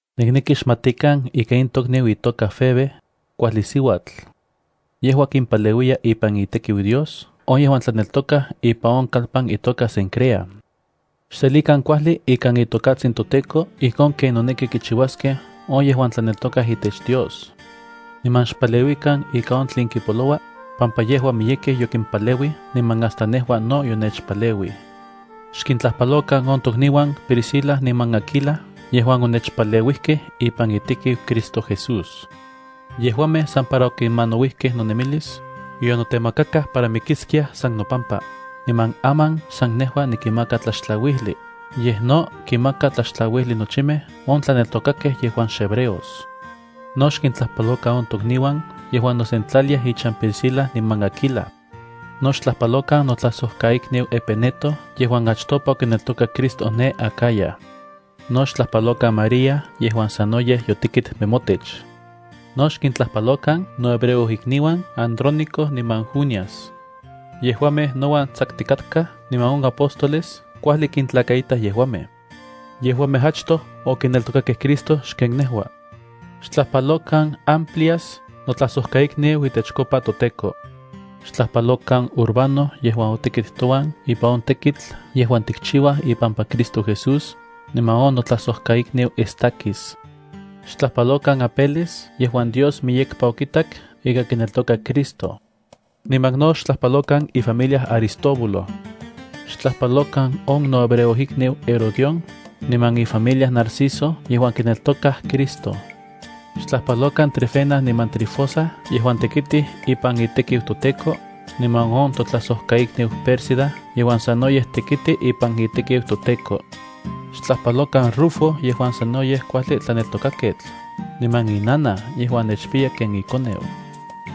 Nikneki xmatikan ika in tokniu itoka Febe, kuajli siuatl. Yejua kimpaleuiya ipan itekiu Dios on yejuan tlaneltokaj ipan on kalpan itoka Cencrea. Xselikan kuajli ikan itokatsin toTEKO ijkon ken noneki kichiuaskej on yejuan tlaneltokaj itech Dios. Niman xpaleuikan ika on tlen kipoloua, pampa yejua miyekej yokimpaleuij niman hasta nejua no yonechpaleuij. Xkintlajpalokan on tokniuan Priscila niman Aquila yejuan onechpaleuijkej ipan itekiu Cristo Jesús. Yejuamej san para okimanauijkej nonemilis, yonetemakakaj para mikiskiaj san nopampa. Niman aman xsan nejua nikinmaka tlaxtlauijli, yej no kinmakaj tlaxtlauijli nochimej on tlaneltokakej yejuan xhebreos. No xkintlajpalokan on tokniuan yejuan nosentlaliaj ichan Priscila niman Aquila. No xtlajpalokan notlajsojkaikniu Epeneto yejuan achtopa okineltokak Cristo ne Acaya. No xtlajpalokan María yejuan sanoyej yotekit nemotech. No xkintlajpalokan nohebreojikniuan Andróniko niman Junias. Yejuamej nouan tsakutikatkaj niman on apóstoles kuajli kintlakaitaj yejuamej. Yejuamej achtoj okineltokakej Cristo xken nejua. Xtlajpalokan Amplias, notlajsojkaikniu itechkopa toTEKO. Xtlajpalokan Urbano yejuan otekit touan ipan on tekitl yejuan tikchiuaj ipampa Cristo Jesús, niman on notlajsojkaikniu Estaquis. Xtlajpalokan Apeles yejuan Dios miyekpa okitak ika kineltoka Cristo. Niman no xtlajpalokan ifamilia Aristóbulo. Xtlajpalokan on nohebreojikniu Herodión, niman ifamilia Narciso yejuan kineltokaj Cristo. Xtlajpalokan Trifena niman Trifosa yejuan tekitij ipan itekiu toTEKO, niman on totlajsojkaikniu Pérsida yejuan sanoyej tekiti ipan itekiu toTEKO. Xtlajpalokan Rufo yejuan sanoyej kuajli tlaneltokaketl, niman inanaj yejuan nechpiya ken ikoneu.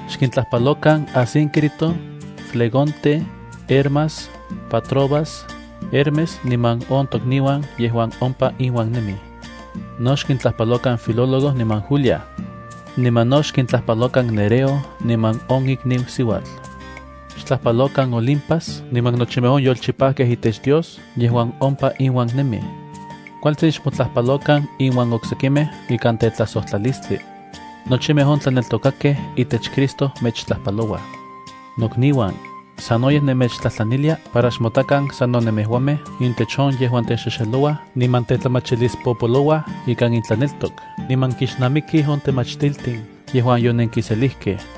Xkintlajpalokan Asíncrito, Flegonte, Hermas, Patrobas, Hermes niman on tokniuan yejuan ompa inuan nemij. No xkintlajpalokan Filólogo niman Julia. Niman no xkintlajpalokan Nereo niman on ikniu siuatl. Xtlajpalokan Olimpas niman nochimej on yolchipajkej itech Dios yejuan ompa inuan nemij. Kualtsin xmotlajpalokan inuan oksekimej ikan tetlajsojtlalistlia Nochimej on tlaneltokakej itech Cristo mechtlajpalouaj. Nokniuan, sanoyej nemechtlajtlanilia para xmotakan sano nemejuamej intech on yejuan texexelouaj niman tetlamachilispopolouaj ikan intlaneltok niman kixnamikij on temachtiltin yejuan yonenkiselijkej.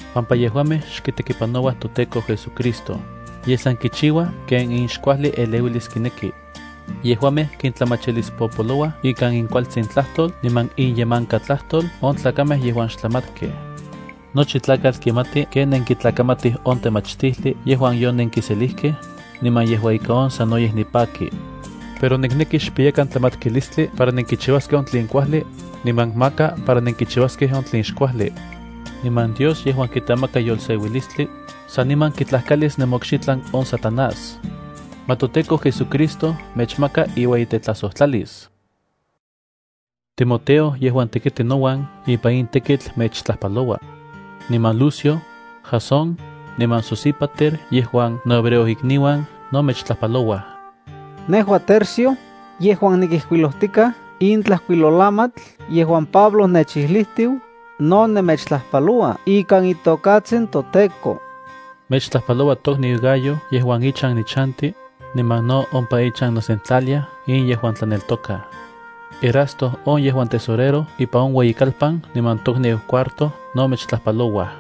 pampa yejuamej xkitekipanouaj toTEKO JesuCristo, yej san kichiuaj ken inxkuajli eleuilis kineki. Yejuamej kintlamachilispopolouaj ikan inkualtsin tlajtol niman inyemankatlajtol on tlakamej yejuan xtlamatkej. Nochi tlakatl kimati ken nenkintlakamatij on temachtijli yejuan yonenkiselijkej, niman yejua ika on sanoyej nipaki. Pero nikneki xpiyakan tlamatkilistli para nenkichiuaskej on tlen kuajli, niman maka para nenkichiuaskej on tlen xkuajli. Niman Dios yejuan kitemaka yolseuilistli saniman kitlajkalis nemokxitlan on Satanás. Ma toTEKO JesuCristo mechmaka iueyitetlajsojtlalis. Timoteo yejuan tekiti nouan ipan in tekitl mechtlajpaloua. Niman Lucio, Jasón, niman Sosípater yejuan nohebreojikniuan no mechtlajpalouaj. Nejua Tercio, yejuan nikijkuilojtikaj in tlajkuilolamatl yejuan Pablo nechijlijtiu, no nemechtlajpaloua ikan itokatsin toTEKO. Mechtlajpaloua tokniu Gayo yejuan ichan nichanti, niman no ompa ichan nosentlaliaj in yejuan tlaneltokaj. Erasto on yejuan tesorero ipan on ueyikalpan niman tokniu Cuarto no mechtlajpalouaj.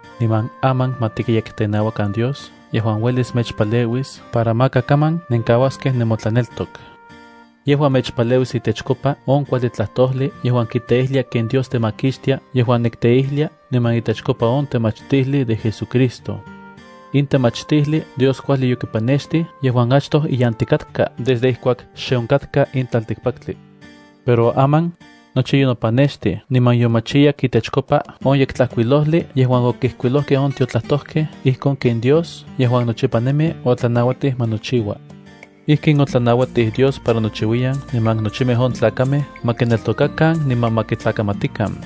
Niman aman ma tikyekteneuakan Dios yejuan uelis mechpaleuis para maka kaman nenkauaskej nemotlaneltok. Yejua mechpaleuis itechkopa on kuajli tlajtojli yejuan kiteijlia ken Dios temakixtia yejuan nikteijlia niman itechkopa on temachtijli de JesuCristo. In temachtijli Dios kuajli yokipanextij yejuan achtoj iyantikatka desde ijkuak xe onkatka in tlaltikpaktli. Pero aman, nochi yonopanextij niman yomachiyak itechkopa on Yektlajkuilojli yejuan okijkuilojkej on tiotlajtojkej ijkon ken Dios yejuan nochipa nemi otlanauatij ma nochiua. Ijkin otlanauatij Dios para nochiuiyan niman nochimej on tlakamej ma kineltokakan niman ma kitlakamatikan.